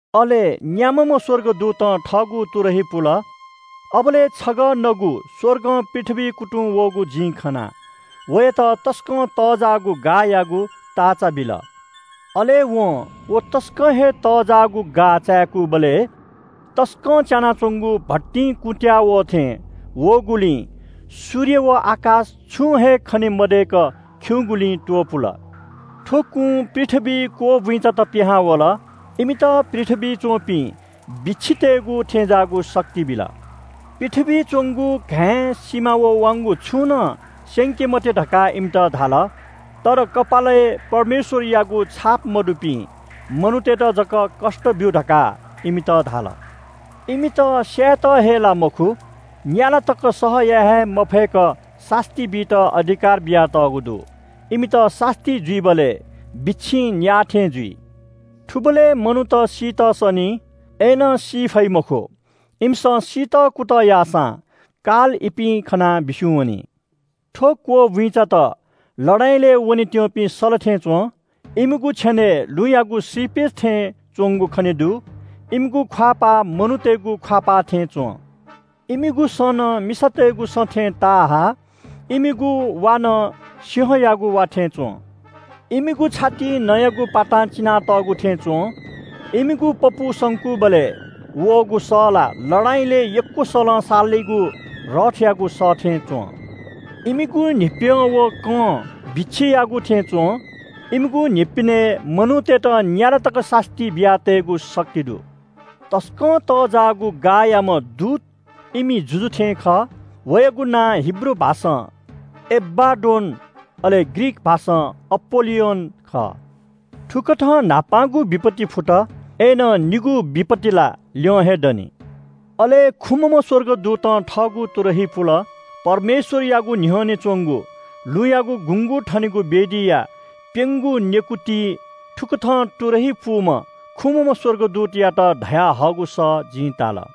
अले न्‍याम्‍हम्‍ह स्‍वर्गदूतं थःगु तुरही पुल। अबलय् छगः नगु स्‍वर्गं पृथ्‍वीइ कुतुं वःगु जिं खना। वयात तसकं तःजाःगु गाःयागु ताःचा बिल। अले वं व तसकं हे तःजाःगु गाः चाय्‌कूबलय् तसकं च्‍यानाच्‍वंगु भट्टिं कुँत्‍याः वः थें वःगुलिं सूर्य व आकाश छुं हे खने मदय्‌क खिउँगुलिं त्‍वपुल। थ्‍व कुं पृथ्‍वीइ क्‍वःबुइँचात पिहां वल। इमित पृथ्‍वीइ च्‍वंपिं बिच्‍छितय्‌गु थें ज्‍याःगु शक्ति बिल। पृथ्‍वीइ च्‍वंगु घाँय्, सिमा व वाउँगु छुं नं स्‍यंके मते धकाः इमित धाल। तर कपालय् परमेश्‍वरयागु छाप मदुपिं मनूतय्‌त जक कष्‍ट ब्‍यु धकाः इमित धाल। इमित स्‍यायेत हे ला मखु, न्‍याला तक सह याये हे मफय्‌क सास्‍ती बीत अधिकार बियातःगु दु। इमित सास्‍ती जुइबलय् बिच्‍छिं न्‍याः थें जुइ। थुबलय् मनूत सीत सनी, अय्‌नं सी फइ मखु। इमिसं सीत कुतः याःसां काल इपिं खनाः बिस्‍युं वनी। थ्‍व क्‍वःबुइँचात लडाइँलय् वनेत्‍यंपिं सल थें च्‍वं। इमिगु छेनय् लुँयागु श्रीपेच थें च्‍वंगु खने दु। इमिगु ख्‍वाःपाः मनूतय्‌गु ख्‍वाःपाः थें च्‍वं। इमिगु सँ नं मिसातय्‌गु सँ थें ताहा। इमिगु वा नं सिंहयागु वा थें च्‍वं। इमिगु छातिइ नँयागु पातां चिनातःगु थें च्‍वं। इमिगु पपू संकूबलय् वःगु सः ला लडाइँलय् यक्‍व सलं सालीगु रथयागु सः थें च्‍वं। इमिगु न्‍हिप्‍यं व कं बिच्‍छियागु थें च्‍वं। इमिगु न्‍हिप्‍यनय् मनूतय्‌त न्‍याला तक सास्‍ती बियातय्‌गु शक्ति दु। तसकं तःजाःगु गाःयाम्‍ह दूत इमि जुजु थें खः। वयागु नां हिब्रू भाषां एबाड्डोन, अले ग्रीक भाषां अपोल्‍लियोन खः। थुकथं न्‍हापांगु विपत्ति फुत, अय्‌नं निगू विपत्ति ला ल्‍यं हे दनि। अले खुम्‍हम्‍ह स्‍वर्गदूतं थःगु तुरही पुल। परमेश्‍वरयागु न्‍ह्यःने च्‍वंगु लुँयागु गुँगू थनेगु वेदीया प्‍यंगू नेकुतिं थुकथं तुरही पूम्‍ह खुम्‍हम्‍ह स्‍वर्गदूतयात धयाहःगु सः जिं ताल –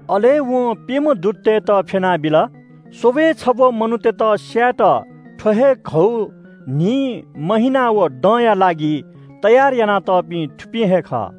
अले वं प्‍यम्‍ह दूततय्‌त फ्‍यना बिल। स्‍वब्‍वय् छब्‍व मनूतय्‌त स्‍यायेत थ्‍व हे घौ, न्‍हि, ला व दँया लागि तयार यानातःपिं थुपिं हे खः।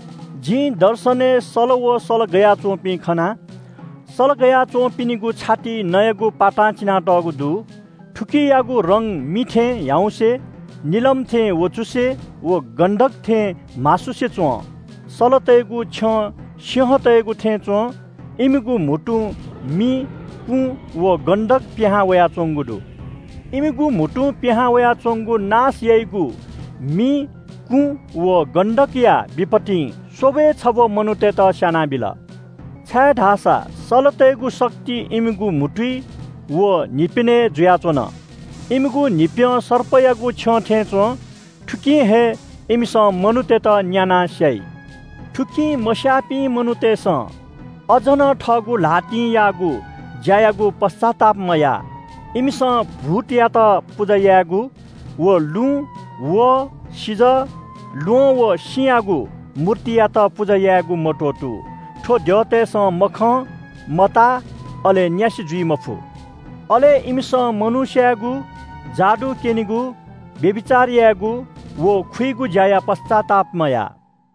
जिं दर्शनय् सल व सल गया च्‍वंपिं खना। सल गया च्‍वंपिनिगु छातिइ नँयागु पातां चिनातःगु दु। थुकियागु रंग मि थें ह्याउँसे, निलम थें वँचुसे व गन्‍धक थें म्‍हासुसे च्‍वं। सलतय्‌गु छ्यं सिंहतय्‌गु थें च्‍वं। इमिगु म्‍हुतुं मि, कुँ, व गन्‍धक पिहां वयाच्‍वंगु दु। इमिगु म्‍हुतुं पिहां वयाच्‍वंगु नाश याइगु मि, कुँ व गन्‍धकया विपत्तिं स्‍वब्‍वय् छब्‍व मनूतय्‌त स्‍यानाबिल। छाय्‌धाःसा सलतय्‌गु शक्ति इमिगु म्‍हुतुइ व न्‍हिप्‍यनय् जुयाच्‍वन। इमिगु न्‍हिप्‍यं सर्पयागु छ्यं थें च्‍वं। थुकिं हे इमिसं मनूतय्‌त न्‍यानाः स्‍याइ। थुकिं मस्‍याःपिं मनूतय्‌सं अझ नं थःगु ल्‍हातिं याःगु ज्‍यायागु पश्‍चाताप मयाः। इमिसं भूतयात पुजा यायेगु व लुँ, वहः, सिजः, ल्‍वहं व सिँयागु मूर्तियात पुजा यायेगु मत्‍वःतू। थ्‍व द्यःतय्‌सं मखं, मताः, अले न्‍यासि जुइ मफु। अले इमिसं मनू स्‍यायेगु, जादु क्‍यनेगु, व्‍यभिचार यायेगु व खुइगु ज्‍याया पश्‍चाताप मयाः।